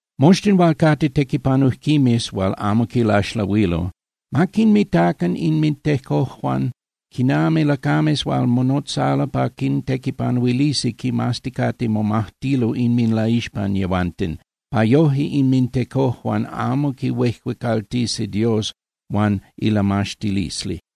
Moxtin hual cate tequipanujquimes hual amo quilaxlahuilo, ma quinmitacan inmintecojuan quinami lacames hual monotzalo pa quintequipanuilisi quimazticate momajtilo inminlaixpan yehuanten, pa yoje inmintecojuan amo quihuejuecaltisi Dios huan ilamaxtilisli.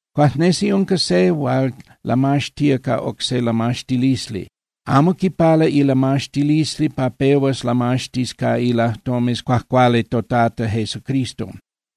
Cuajnesi unca se hual lamaxtía ca oc se lamaxtilisli. Amo quipala ilamaxtilisli pa pehuas lamaxtis ca ilajtomes cuajcuali toTata Jesucristo.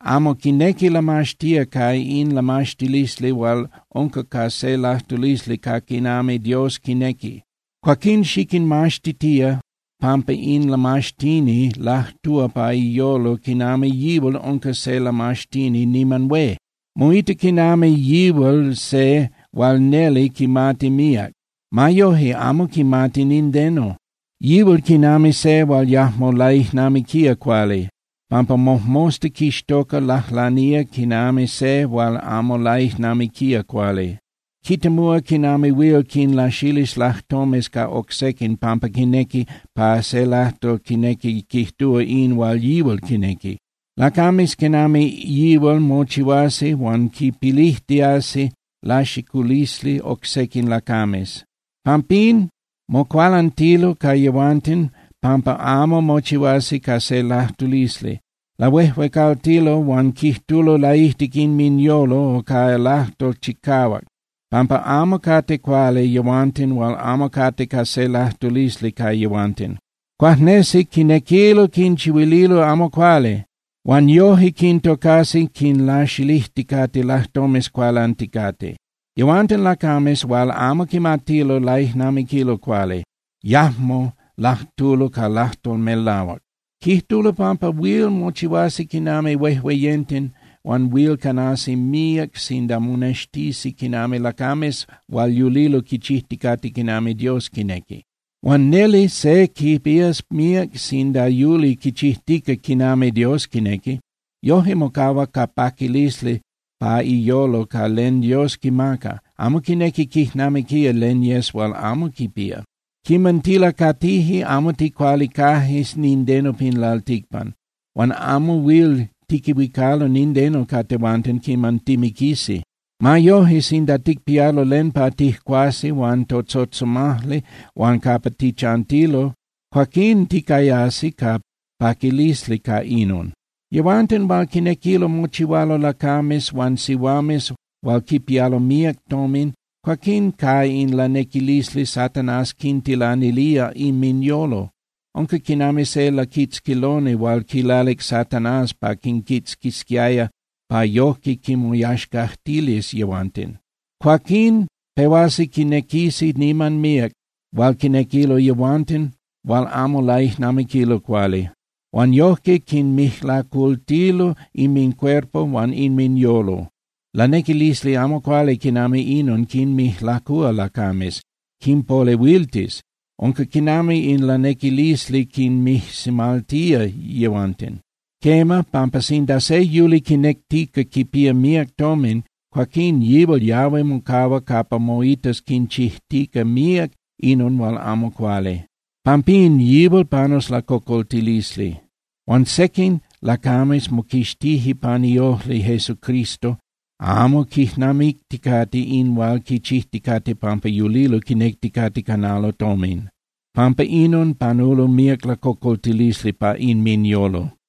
Amo quinequi lamaxtía ca in lamaxtilisli hual unca ca se lajtulisli ca quinami Dios quinequi. Cuaquín xiquinmaxtitía pampa in lamaxtini lajtúa pa iyolo quinami yihual unca se lamaxtini niman hué. Moita quinami yihual se hual neli quimati míac. Ma yoje, amo quimati nindeno. Yihual quinami se hual yajmo laijnamiquía cuali, pampa mojmosta quixtoca lajlanía quinami se hual amo laijnamiquía cuali. Quitemúa quinami huil quinlaxilis lajtomes ca oc sequin pampa quinequi pa se lajtol quinequi quijtúa in hual yihual quinequi. Lacames quinami yihual mochihuasi hual quipilijtiasi laxiculisli oc sequin lacames. Pampín mocualantilo ca yehuanten pampa amo mochihuasi ca se lajtulisli. Lahuejuecaltilo huan quijtulo laijtic inminyolo o ca lajtol chicahuac pampa amo cate cuali yehuanten hual amo cate ca se lajtulisli ca yehuanten. Cuajnesi quinequilo quinchihuililo amo cuali. Huan yoje quintocasi quinlaxilijticate lajtomes cualanticate. Yehuanten lacames hual amo quimatilo laijnamiquilo cuali, yajmo lajtulo ca lajtol melahuac. Quijtulo pampa huil mochihuasi quinami huejueyenten huan huil canasi míac sinda monextisi quinami lacames hual yulilo quichijticate quinami Dios quinequi. Huan neli se quipías míac sinda yuli quichijtica quinami Dios quinequi. Yoje mocahua ca paquilisli pa iyolo ca len Dios quimaca, amo quinequi quijnamiquía len yes hual amo quipía. Quiman tilacatije, amo ticualicaje nindeno pin lalticpan. Huan amo huil tiquihuicalo nindeno ca tehuanten quiman timiquisi. Ma yoje, sinda ticpialo len pa tijcuasi huan totzotzomajli huan capa tichantilo, cuaquín ticayasi ca paquilisli ca inon. Yehuanten hual quinequilo mochihualo lacames huan sihuames hual quipialo míac tomin, cuaquín ca in lanequilisli Satanás quintilanilía inminyolo. Unca quinami se laquitzquiloni hual quilalic Satanás pa quinquitzquisquiaya pa yojque quinmoyaxcajtilis yehuanten. Cuaquín pehuasi quinequisi niman míac hual quinequilo yehuanten hual amo laijnamiquilo cuali. Huan yojque quinmijlacultilo inmincuerpo huan inminyolo. Lanequilisli amo cuali quinami inon quinmijlacúa lacames, quinpolehuiltis, unca quinami in lanequilisli quinmijsimaltía yehuanten. Quema, pampa sinda se yuli quinectica quipía míac tomin, cuaquin yihual yahui mocahua capa moitas quinchijtica míac inon hual amo cuali. Pampín yihual panus lacocoltilisli. Huan sequin lacames moquixtije pan iojli Jesucristo, amo quijnamicticate in hual quichijticate pampa yulilo quinecticate canalo tomin. Pampa inon panulo míac lacocoltilisli pa inminyolo.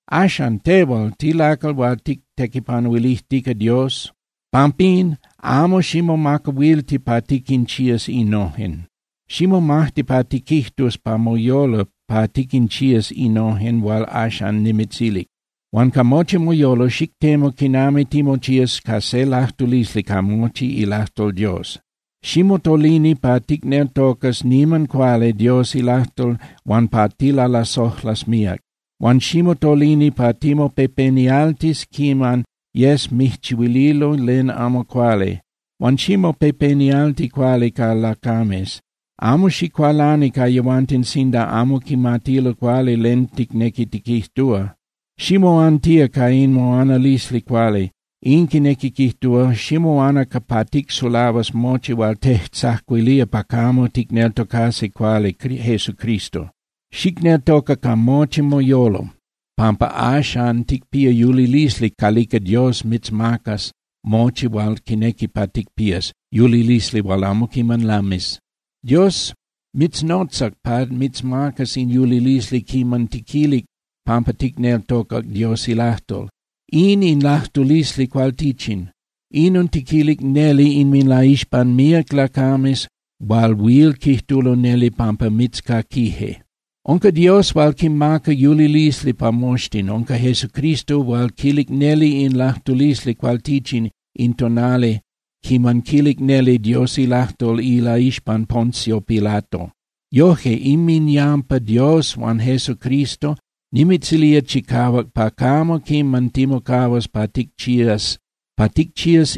Axan, tehual, tilacal hual tictequipanuilijtica Dios. Pampín, amo ximomacahuilti pa tiquinchías innojen. Ximomajti pa tiquijtus pa moyolo pa tiquinchías innojen hual axan nimitzilic. Huan ca mochi moyolo, xictemu quinami timochías ca se lajtulisli ca mochi ilajtol Dios. Ximotolini pa ticneltocas niman cuali Dios ilajtol huan pa tilalasojlas míac. Huan ximotolini pa timopepenialtis quiman yes mijchihuililo len amo cuali. Huan ximopepenialti cuali ca lacames. Amo xicualani ca yehuanten sinda amo quimatilo cuali len ticnequi tiquijtúa. Ximoantía ca in moanalisli cuali, in quinequi quijtúa, ximoana pa ticsulahuas mochi hual tejtzacuilía pa camo ticneltocasi cuali Jesucristo. Xicneltoca ca mochi moyolo, pampa axan ticpía yulilisli calica Dios mitzmacas mochi hual quinequi pa ticpías, yulilisli hual amo quiman lamis. Dios mitznotzac pa mitzmacas in yulilisli quiman tiquilic pampa ticneltocac Dios ilajtol. In in lajtulisli cualtichin, inon tiquilic neli inminlaixpan míac lacames hual huil quijtulo neli pampa mitzcaquije. Unca Dios hual quimaca yulilisli pa moxtin. Unca Jesucristo hual quilic neli in lajtulisli cualtichin in tonali quiman quilic neli Dios ilajtol ilaixpan Poncio Pilato. Yoje, inminyampa Dios huan Jesucristo, nimitzilía chicahuac pa camo quiman timocahuas pa ticchías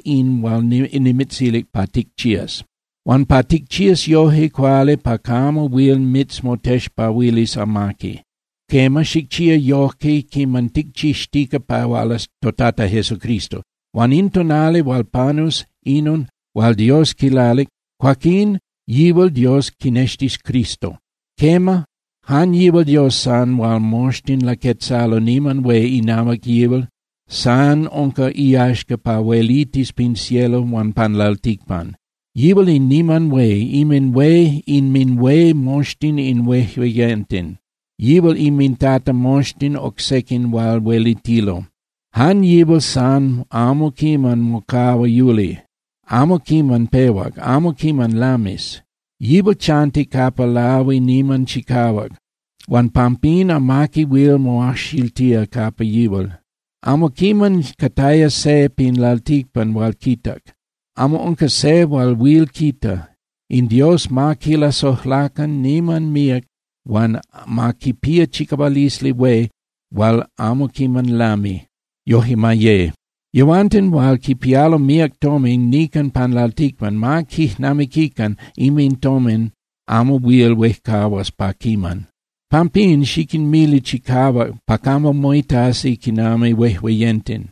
in hual nimitzilic pa ticchías, huan pa ticchías yoje cuali pa camo huil mitzmotexpahuilis amaqui. Quema, xicchía yoje quiman ticchixtica pa hualas toTata Jesucristo. Huan in tonali hual panus inon hual Dios quilalic, cuaquín yihual Dios quinextis Cristo. Quema, jan yihual Dios san hual moxtin laquetzalo niman hué inahuac yihual, san unca iyaxca pa huelitis pin cielo huan pan lalticpan. Yihual in niman hué, inminhué moxtin in huejueyenten, yihual inminTata moxtin oc sequin hual huelitilo. Jan yihual san amo quiman mocahua yuli. Amo quiman pehuac, amo quiman lamis. Yihual chanti capa lahui niman chicahuac huan pampín amaqui huil moajxiltía capa yihual. Amo quiman cataya se pin lalticpan hual quitac, amo unca se hual huil quita. In Dios ma quilasojlacan niman míac huan ma quipía chicahualisli hué hual amo quiman lami. Yoje ma ye. Yehuanten hual quipialo míac tomin nican pan lalticpan, ma quijnamiquican inmintomin amo huil huejcahuas pa quiman. Pampín, xiquinmili chicahuac pa camo moitasi quinami huejueyenten.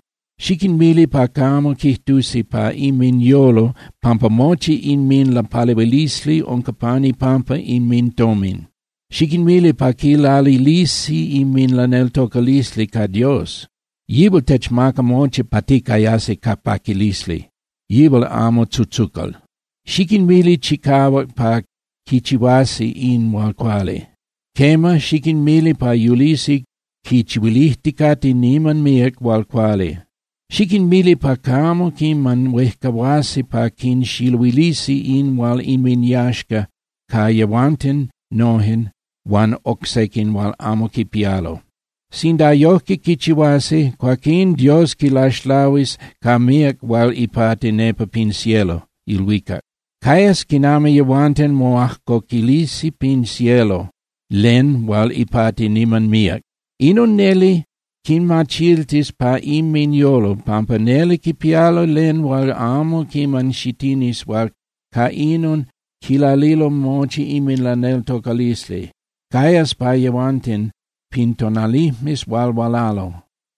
Xiquinmili pa camo quijtusi pa inminyolo pampa mochi inminlapalehuilisli unca pan ipampa inmintomin. Xiquinmili pa quilalilisi inminlaneltocalisli ca Dios. Yihual techmaca mochi pa ticayasi ca paquilisli, yihual amo tzutzucal. Xiquinmili chicahuac pa quichihuasi in hual cuali. Quema, xiquinmili pa yulisi quichihuilijticate niman míac hual cuali. Xiquinmili pa camo quiman huejcahuasi pa quinxiluilisi in hual inminyaxca ca yehuanten nojen huan oc sequin hual amo quipialo. Sinda yojque quichihuasi, cuaquín Dios quinlaxlahuis ca míac hual ipati nepa pin cielo (ilhuicac). Cayas quinami yehuanten moajcoquilisi pin cielo len hual ipati niman míac. Inon neli quinmachiltis pa inminyolo pampa neli quipialo len hual amo quiman xitinis hual ca inon quilalilo mochi inminlaneltocalisli. Cayas pa yehuanten pin tonalijmes hual hualalo.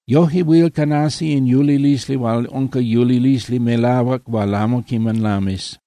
Yoje huil canasi in yulilisli hual unca yulilisli melahuac hual amo quiman lamis.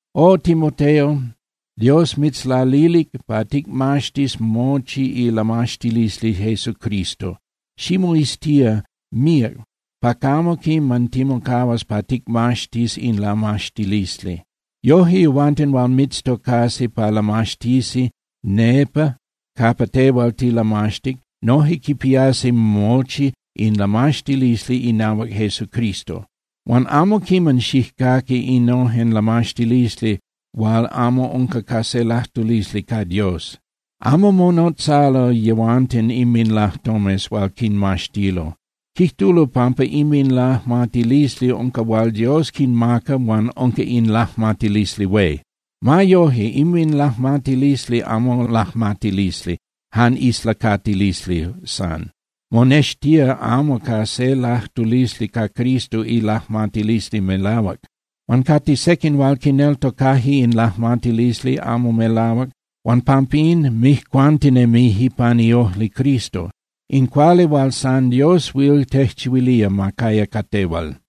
O Timoteo, Dios mitzlalilic pa ticmaxtis mochi ilamaxtilisli Jesucristo. Ximoiztía míac pa camo quiman timocahuas pa ticmaxtis in lamaxtilisli. Yoje yehuanten hual mitztocasi pa lamaxtisi nepa capa tehual tilamaxtic noje quipiasi mochi in lamaxtilisli inahuac Jesucristo. Huan amo quiman xijcaqui innojen lamaxtilisli hual amo unca ca se lajtulisli ca Dios. Amo monotzalo yehuanten inminlajtomes hual quinmaxtilo. Quijtulo pampa inminlajmatilisli unca hual Dios quinmaca huan unca in lajmatilisli hué. Ma yoje, inminlajmatilisli amo lajmatilisli, jan islacatilisli san. Monextía amo ca se lajtulisli ca Cristo ilajmatilisli melahuac. Huan cate sequin hual quineltocaje in lajmatilisli amo melahuac huan pampín mijcuantinemije pan iojli Cristo. In cuali hual san Dios huil tejchihuilía ma caya ca tehual.